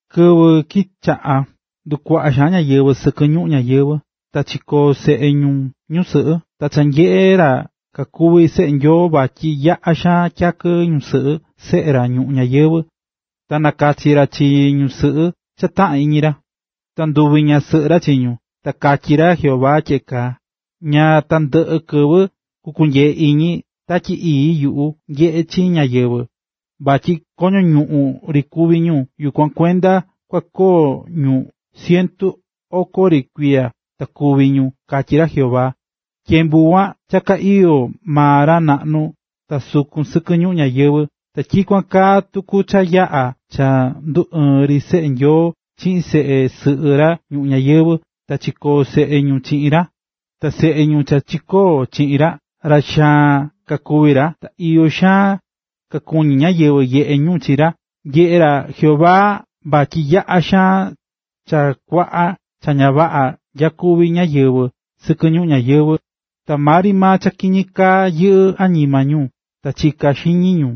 Kɨvɨ kichaꞌa̱ ndukuaꞌá ñáyɨvɨ sɨkɨ ñuꞌún ñayɨvɨ̱, ta chikoo̱ seꞌe ñu ñusɨꞌɨ. Ta cha nyeꞌe̱ ra kakuví seꞌe Nyoo, vatyi yaꞌa xaan tyakɨ ñusɨꞌɨ seꞌe ra ñuꞌún ñayɨvɨ̱, ta nakachi̱ ra chi ñusɨꞌɨ cha taꞌán iñi ra, ta nduvi̱ ñasɨꞌɨ ra chi ñu. Ta katyí ra Jehová tyeꞌe kaa: “Ña tandɨꞌɨ kɨvɨ kukunyee iñi Tatyi Ii yuꞌu nyeꞌe chi chi ñáyɨvɨ, vatyi koño ñuꞌún ri kuví ñu, yukuan kuenda kua koo ñu cientu oko ri kuiya ta kúvi ñu”, katyí ra Jehová. Tyembu kuan cha ka iyó maa ra naꞌnu ta sukun sɨkɨ ñuꞌún ñayɨvɨ̱. Ta tyikuan kaa tuku cha yaꞌa̱ cha nduɨɨ̱n ri seꞌe Nyoo chiꞌin seꞌe sɨꞌɨ ra ñuꞌún ñayɨvɨ̱ ta chikóo seꞌe ñu chiꞌin ra, ta seꞌe ñu cha chikóo chiꞌin ra, ra xaan kakuvi̱ ra, ta iyo xaan kakuñí ñáyɨvɨ nyeꞌé ñu chi ra. Nyeꞌé ra Jehová vatyi yaꞌa xaan cha kuaꞌa cha ña vaꞌa nyakuví ñáyɨvɨ nu ñuꞌún ñayɨvɨ̱, ta maa ri cha kiñi kaá yɨꞌɨ́ añima ñu ta chiká xiñi ñu.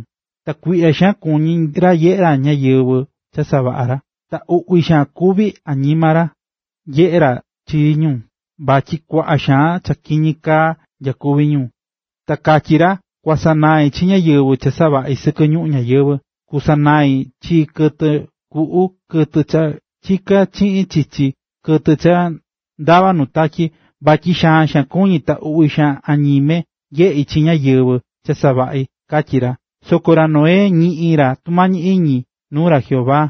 Ta kuiꞌya xaan kuñí ra nyeꞌé ra chi ñáyɨvɨ cha savaꞌa̱ ra, ta uꞌvi xaan kuví añima ra nyeꞌé ra chi ñu, vatyi kuaꞌa xaan cha kiñi kaá nyakuví ñu. Ta katyí ra: “Kuasanai chi ñáyɨvɨ cha savaꞌi̱ sɨkɨ ñuꞌún ñayɨvɨ̱, kusanai chi kɨtɨ kuꞌu, kɨtɨ cha chiká chiꞌin chichi, kɨtɨ cha ndavá nu tatyi, vatyi xaan xaan kuñí ta uꞌvi xaan añime nyeꞌí chi ñáyɨvɨ cha savaꞌi̱”, katyí ra. Soko ra Noé ñiꞌi̱n ra tumañi iñi nuu ra Jehová.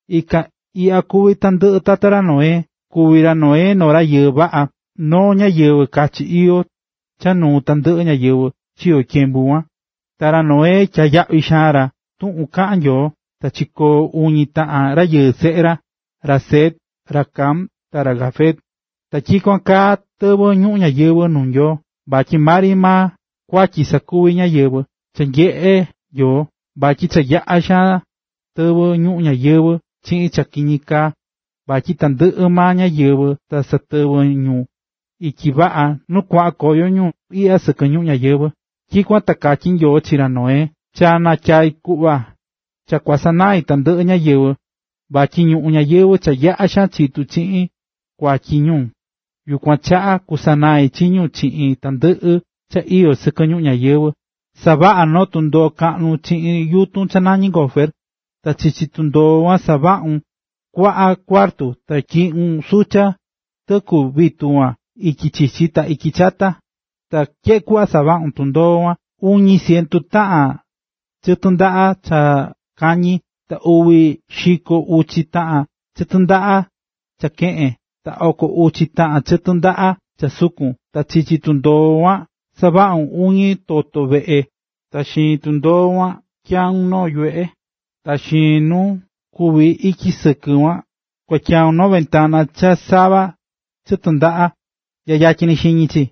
Ikan iꞌya kuví tandɨꞌɨ tata ra Noé. Kuvi̱ ra Noé noo rayɨɨ vaꞌa, ta noo ñáyɨvɨ kachi iyó, cha nuu tandɨꞌɨ ñáyɨvɨ chiyo̱ tyembu kuan, ta ra Noé tyaá yaꞌvi xaan ra tuꞌun kaꞌán Nyoo. Ta chikoo̱ uñi taꞌan rayɨɨ seꞌe ra: ra Sem, ra Cam ta ra Jafet. Ta tyikuan kaa tɨvɨ̱ ñuꞌún ñayɨvɨ̱ nuu Nyoo, vatyi maa ri maa kuatyi sakuví ñáyɨvɨ. Cha nyeꞌe̱ Nyoo, vatyi cha yaꞌa̱ tɨvɨ̱ ñuꞌún ñayɨvɨ̱ chiꞌin cha kiñi kaa, vatyi tandɨꞌɨ maa ñáyɨvɨ ta satɨvɨ́ ñu ityi vaꞌa nu kuaꞌan koyo ñu iꞌya sɨkɨ ñuꞌún ñáyɨvɨ. Tyikuan ta katyí Nyoo chi ra Noé: “Cha natyai̱ kuꞌva cha kusanain tandɨꞌɨ ñáyɨvɨ, vatyi ñuꞌún ñayɨvɨ̱, cha yaꞌa̱ chitu̱ chiꞌin kuatyi ñu. Yukuan chaꞌa kusanai chi ñu chiꞌin tandɨꞌɨ cha iyó sɨkɨ ñuꞌún ñayɨvɨ̱. Sa̱vaꞌa noo tundoo kaꞌnu chiꞌin yutun cha nañí gofer, ta chichi tundoo kuan, savaꞌun kuaꞌa cuartu, ta tyiꞌun sucha tɨku vitu kuan ityi chichi ta ityi chata. Ta tyeꞌe kuꞌva kua savaꞌun tundoo kuan: Uñi cientu taꞌan chɨtɨ ndaꞌa cha kañi, ta uvi xiko uchi taꞌan chɨtɨ ndaꞌa cha keꞌen, ta oko uchi taꞌan chɨtɨ ndaꞌa cha sukun. Ta chichi tundoo kuan savaꞌun uñi toto veꞌe ta xiin tundoo kuan tyaun noo yuveꞌe. Ta xiin nama nu kuví ityi sɨkɨ kuan kua tyaun noo ventana cha sava chɨtɨ ndaꞌa nya yatyin xiñi chi.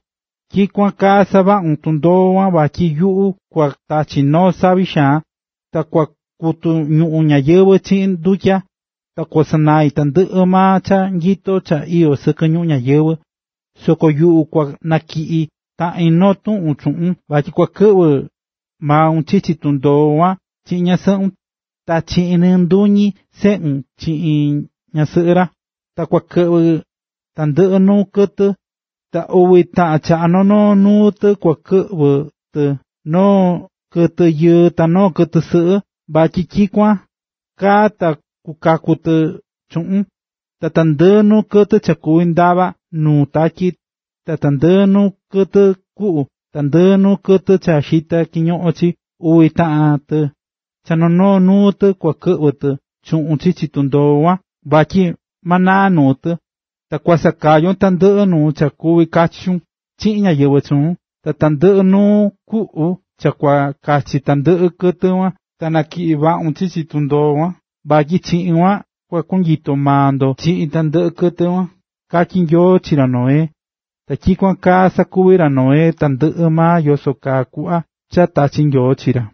Tyikuan kaa savaꞌun tundoo kuan vatyi yuꞌu kua tachi noo savi xaan, ta kua kutu ñuꞌún ñayɨvɨ̱ chiꞌin ndutya, ta kusanai tandɨꞌɨ maa cha nyito cha iyó sɨkɨ ñuꞌún ñayɨvɨ̱. Soko yuꞌu kua natyiꞌi taꞌin noo tuꞌun chuꞌun, vatyi kua kɨꞌvɨ maun chichi tundoo kuan, chiꞌin ñasɨꞌun, ta chiꞌin nɨ nduñi seꞌun chiꞌin ñasɨꞌɨ ra. Ta kua kɨꞌvɨ tandɨꞌɨ nuu kɨtɨ. Ta uvi taꞌan cha noo noo nuu tɨ kua kɨꞌvɨ tɨ, noo kɨtɨ yɨɨ ta noo kɨtɨ sɨꞌɨ, vatyi tyikuan kaa ta kukaku tɨ chuꞌun. Ta tandɨꞌɨ nuu kɨtɨ cha kuvi ndavá nuu tatyi, ta tandɨꞌɨ nuu kɨtɨ kuꞌu, ta tandɨꞌɨ nuu kɨtɨ cha xitá kiñoꞌon chii, uvi taꞌan tɨ, cha noo noo nuu tɨ, kua kɨꞌvɨ tɨ chuꞌun chichi tundoo kuan, vatyi ma naa tɨ. Ta kua sakayon tandɨꞌɨ nuu cha kuvi kachun chiꞌin ñáyɨvɨ chuun, ta tandɨꞌɨ nuu kuꞌu cha kua kachi tandɨꞌɨ kɨtɨ kuan, ta natyiꞌi vaꞌun chichi tundoo kuan, vatyi chiꞌin kuan kua konyito maa ndo chiꞌin tandɨꞌɨ kɨtɨ kuan”, katyí Nyoo chi ra Noé. Ta tyikuan kaa sakuvi̱ ra Noé, tandɨꞌɨ maa yoso kaa kuꞌva cha tachi̱ Nyoo chi ra.